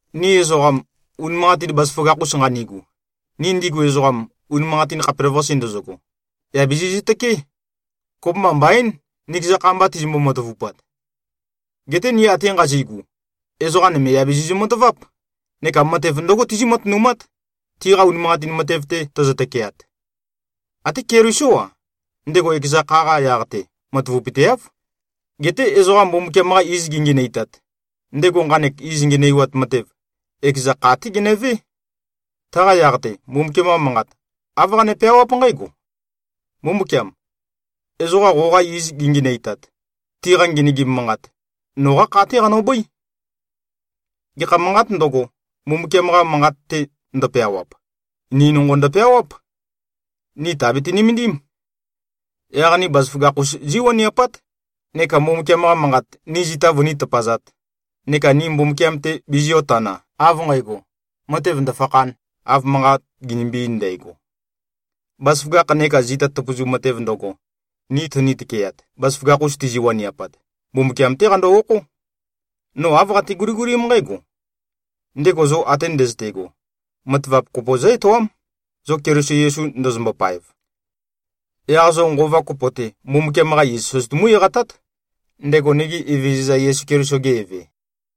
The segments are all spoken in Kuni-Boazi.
Ni ezoqam, unimanqatin bazaføgakh-us nqanigu, ni ndigu ezoqam, unimanqatin khapelavøqase ndøzøgo, yà bizizø-tøkeé. Kopømba mbaín, nikeza kha mba tizimbo-matavupat. Geté ni ate nqazi꞉gu, ezoqa nøme yà bizizø-mataváp, neka matev ndǿgo tizí-matønumát, tiqa unimanqatin matev-te tøzø-tøkeat. Até Kelisó-a, ndego ekeza kha-qa yaq-te matavapøteáv. Geté ezoqa Mbumbukiam-qa iz gingenøitat, ndego nqanek iz ngenøiwat matev, ekeza kha-té genøvé. Taqa yaq-te, Mbumbukiam-qa manqat, āv qane-peawáp nqǽgo, “Mbumbukiam! Ezoqa qoqa iz gingenøitat, tiqa ngenøgim manqat, noqá kha-té qanøbøí.” Gekha manqāt ndøgo, Mbumbukiam-qa Manqat-te ndøpeawap, ni nonqo ndøpeawáp. Ni tàbete-nømendím. Yaq ni bazaføgakh-us zí꞉waniapát, neka Mbumbukiam-qa Manqat, ni zita vøní-tøpazāt, neka ni Mbumbukiam-te biziō-tana, av nqægo, matev ndø̀fakhān, av manqat ginimbi-ein ndægo. Bazaføgakh neka zita tøpøzu matev ndøgo, ni tøni-tøkeat, bazaføgakh-us tizi-waniapat, Mbumbukiam-té qando-okhó. No āv qate-guligulím nqǽgo: Ndego zo ate ndøzøte꞉go, matavap kopo zǿ-etoám, zo Keliso Yesu ndozombo-paev. Yaq zo nqova kopo-te, Mbumbukiam-qa iz søzøtumú-eqatát, ndego nigi Evezøza Yesu Keliso-ge Eve.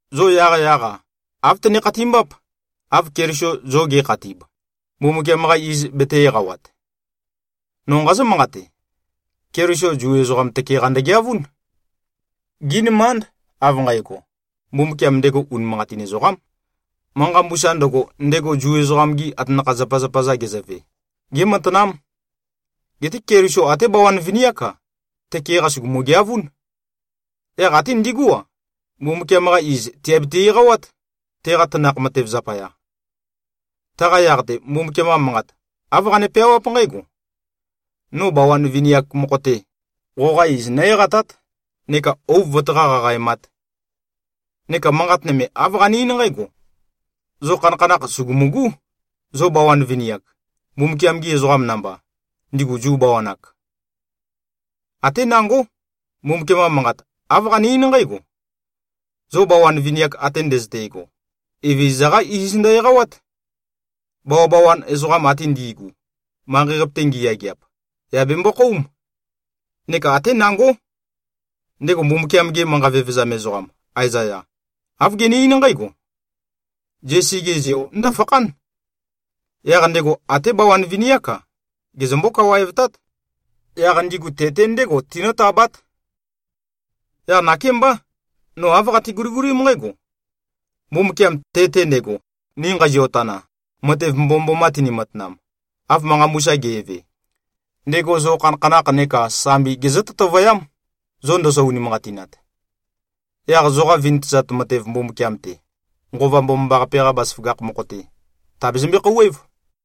Zo yaqyaq-a, āv tøne-khatimbáp, av Keliso zo ge꞉khatib, Mbumbukiam-qa iz betē-eqawat. No nqazǿ-manqate: Keliso Zu ezoqam tøke-qa ndøgeavún. Gí꞉nømánd, av nqægo, Mbumbukiam ndego unimanqatin ezoqám. Manqa mbusa ndøgo, ndego Zu ezoqam-gi atanakha-zapazapa-za gezøve, gématanám. Geté Keliso ate bawan vini-ák-a, tøke-qa sùgumu-geavún. Yaq até ndigú-a, Mbumbukiam-qa iz, tìabiti-eqawát, teqa tanakh matev zapaya. Taqa yaq-te, Mbumbukiam-qa Manqat, āv qane-peawáp nqǽgo, “No bawan vini-ak mokho-te, qoqa iz nǿ-eqatát neka ouv vøtaqá-qaqaemāt.” Neka manqat nøme, āv qane-eín nqǽgo, “Zo khanakhanakh, sùgumugú, zo bawan vini-ak, Mbumbukiam-gi ezoqam namba, ndigu Zu bawan-ak.” Até nangó, Mbumbukiam-qa Manqat, āv qane-eín nqǽgo, “Zo bawan vini-ak ate ndøzøte꞉go, Evezøza-qá iz ndø-eqawát. Bawabawan ezoqam ate ndi꞉gu, manqei-qape-te ngiyageap, yà bembokhóum.” Neka até nangó, ndego Mbumbukiam-ge manqa vevezam ezoqam Aezaya, āv gene-eín nqǽgo, “Zesi-ge zeo ndǿfakhán. Yaq ndego até bawan vini-ák-a, gezømbó-kawaevtát. Yaq ndigu te-te ndégo tinǿtabát.” Yaq nakémbá, no āv qate-guligulím nqǽgo: Mbumbukiam, te-te ndego, ni nqazio-tana, matev mbomømboma tini-matanam, av manqa mbusa ge꞉ve, ndego zo khanakhanakh neka sambi gezǿ-tøtøvøyám, zo ndozo-unimanqatinat. Yaq zoqa vintøzat matev Mbumbukiam-te, Nqova Mbomambaqape-qa bazaføgakh mokho-te, tàbezømbe-khouwév.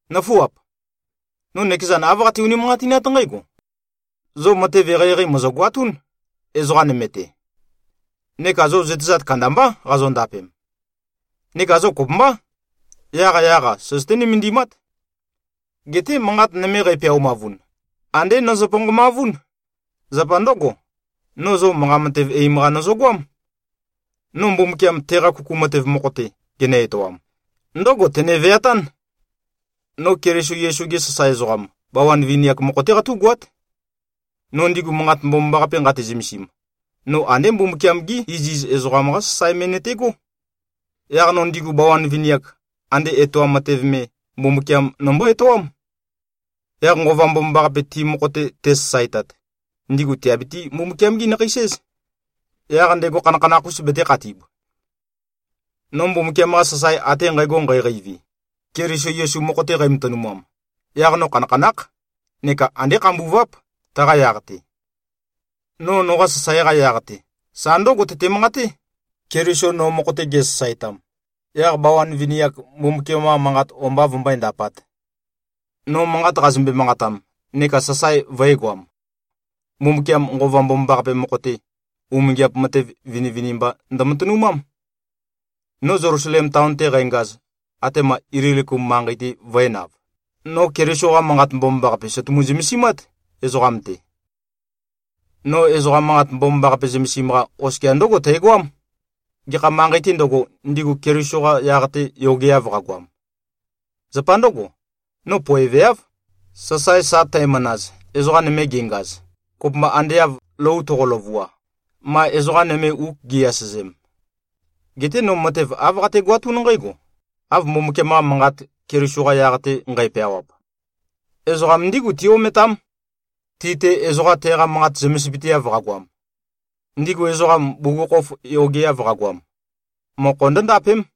Nǿfuap! No nøkezan āv qate-unimanqatinát nqǽgo: Zo matev eqeieqei mòzogoatún, ezoqa nøme-te. Neka zo zøtezat kandambá qazondapem. Neka zo kopømbá. Yaqyaq-a søzøté-nømendimát. Geté manqat nøme, qæpeaumavun, andé nøzø-ponqomavún. Zapa ndǿgo, no zo manqa matev eim-qa nøzøgoám. No Mbumbukiam teqa kuku matev mokho-te, genø-etoam, ndǿgo tene-veatán: No Keliso Yesu-ge sasae ezoqam, bawan vini-ak mokho-té qatú꞉goát. No ndigu Manqat Mbomambaqape nqate-zømesim, no andé Mbumbukiam-gí iziz ezoqam-qa sasae me nøtegó. Yaq no ndigu bawan vini-ak, ande etoam matev me, Mbumbukiam nombó-etoám. Yaq Nqova Mbomambaqape ti mokho-te tesasaetat, ndigu tìabiti-Mbumbukiam-gi-nakheis-éz, yaq ndego khanakhanakh-us betēkhatib. No Mbumbukiam-qa sasae ate nqægo nqæqeivi, Keliso Yesu mokho-te qæmatønumam, yaq no khanakhanákh neka andé khambuváp, taqa yaq-te. No noqa sasae-qa yaq-te, sa ndǿgo tøte-manqaté, Keliso no mokho-te gesasaetam, yaq bawan vini-ak Mbumbukiam-qa manqat o-mba vømbøé-ndapāt. No manqat qazømbe-manqatam neka sasae vø̄egoam, Mbumbukiam Nqova Mbomambaqape mokho-te, umingiap matev vinivinimba ndømatønumám. No Zelusalem taon-te qængaz, atema Ililikum manqei-te vø̄enav, no Keliso-qa Manqat Mbomambaqape sø̀tumu-zømesimát, ezoqam-te. No ezoqa Manqat Mbomambaqape zømesim-qa, oskia ndǿgo tægoám, gekha manqei-tē ndøgo, ndigu Keliso-qa yaq-te yogeav qagoam. Zapa ndǿgo, no poeveáv, sasae sa tæmanaz, ezoqa nøme gengaz, kopømba ande av lou toqo-løvua, ma ezoqa nøme uk gi꞉-asøzem. Geté no matev āv qategoatún nqǽgo, av Mbumbukiam-qa Manqat, Keliso-qa yaq-te nqæpeawap, “Ezoqam ndígu tí-ometám, ti-te ezoqa teqa manqat zømesipøteav qagoam. Ndigu ezoqam, bugukhokhof yogeav qagoam, mokho ndǿndapém.”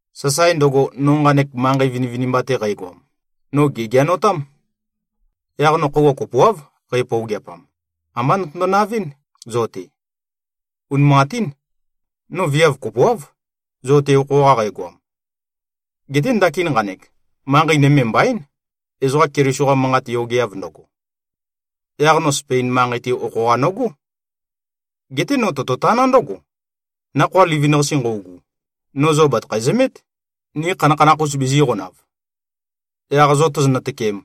Sasae ndøgo, no nqanek manqei vinivinimba-te qægoam, no gègeanotám. Yaq no khøuwa kopoáv, qæpøogeapam, ambá notøndo-navɨ́n, zo-te. Unimanqatín. No viav kopoáv, zo-te okho-qa qægoam. Geté ndakin nqanek, manqei nøme mbaín, ezoqa Keliso-qa manqat yogeav ndøgo. Yaq no Spein manqei-te, okho-qa nogó. Geté no tototaná ndǿgo: Nakhoa livin-qase nqøugu, no zo bàtøkhæ-zømét, ni khanakhanakh-us bizīqonav. Yaq zo tozonø-tøkem,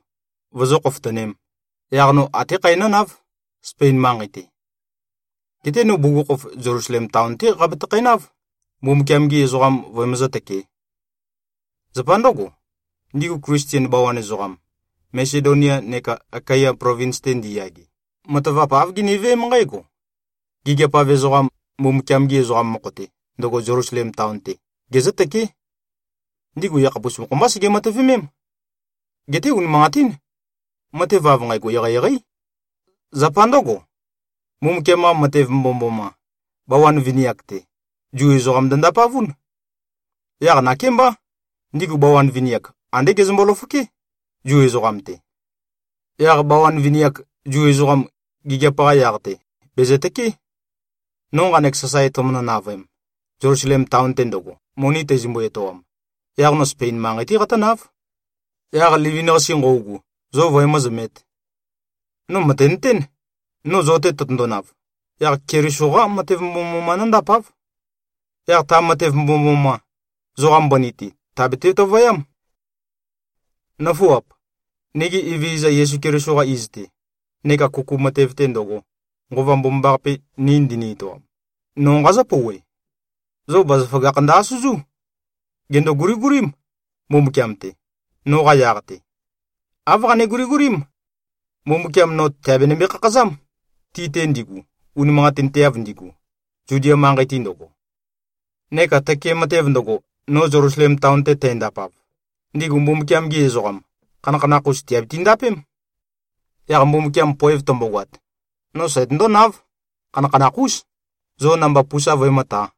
vozó-khofotønēm, yaq no até khæ nǿnáv, Spein manqei-te. Geté no bugukhokhof Zelusalem taon-té qabatøkhænáv, Mbumbukiam-gi ezoqam vøemøzǿ-tøkē. Zapa ndǿgo, ndigu Klisten bawan ezoqam, Masedonia neka Akaya plovins-te ndiyage, matavap āv giniveém nqǽgo: Gigiap-av ezoqam, Mbumbukiam-gi ezoqam mokho-te, ndøgo Zelusalem taon-te, gezǿtøké. Ndigu yakhapus mokho-mbá sege-matøvemém. Geté unimanqatín. Matev av nqægo eqeieqeí. Zapa ndǿgo, Mbumbukiam-qa matev mbomømboma, bawan vini-ak-te, Zu ezoqam ndø-ndapavún. Yaq nakémbá, ndigu bawan vini-ak, andé gezømbo-løfoké, Zu ezoqam-te. Yaq bawan vini-ak, Zu ezoqam, gigiap-qa yaq-te bèzøtøké. No nqanek sasae tømønø-navøem, Zelusalem taon-te ndøgo, moni tæzømbu-etoam, yaq no Spein manqei-té qatǿnáv, yaq livin-qase nqøugu, zo vøemǿzømēt. No mø̀tenøtén, no zo-te tøtøndonav, yaq Keliso-qá matev mbomømboma nóndapáv. Yaq ta matev mbomømboma, zoqa mbøni-te tàbete-tøtøvøyám. Nøfuap! Nigi Evezøza Yesu Keliso-qa iz-te, neka kuku matev-te ndøgo, Nqova Mbomambaqape ni ndini-etoam, no nqazǿ-pouwe: Zo bazaføgakh ndø-asøzú. Gèndo-guligulím, Mbumbukiam-te, noqa yaq-te. Āv qane-guligulím: Mbumbukiam no tèabenømbe-khakhazám, ti-te ndigu, unimanqatinteav ndigu, Zudia manqei-te ndøgo. Neka tøke matev ndøgo, no Zelusalem taon-te tændapav, ndigu Mbumbukiam-gi ezoqam, khanakhanakh-us tìabiti-ndapém. Yaq Mbumbukiam poev tømbogoat, no sætøndónáv, khanakhanakh-ús, zo namba pusa vøemǿtā.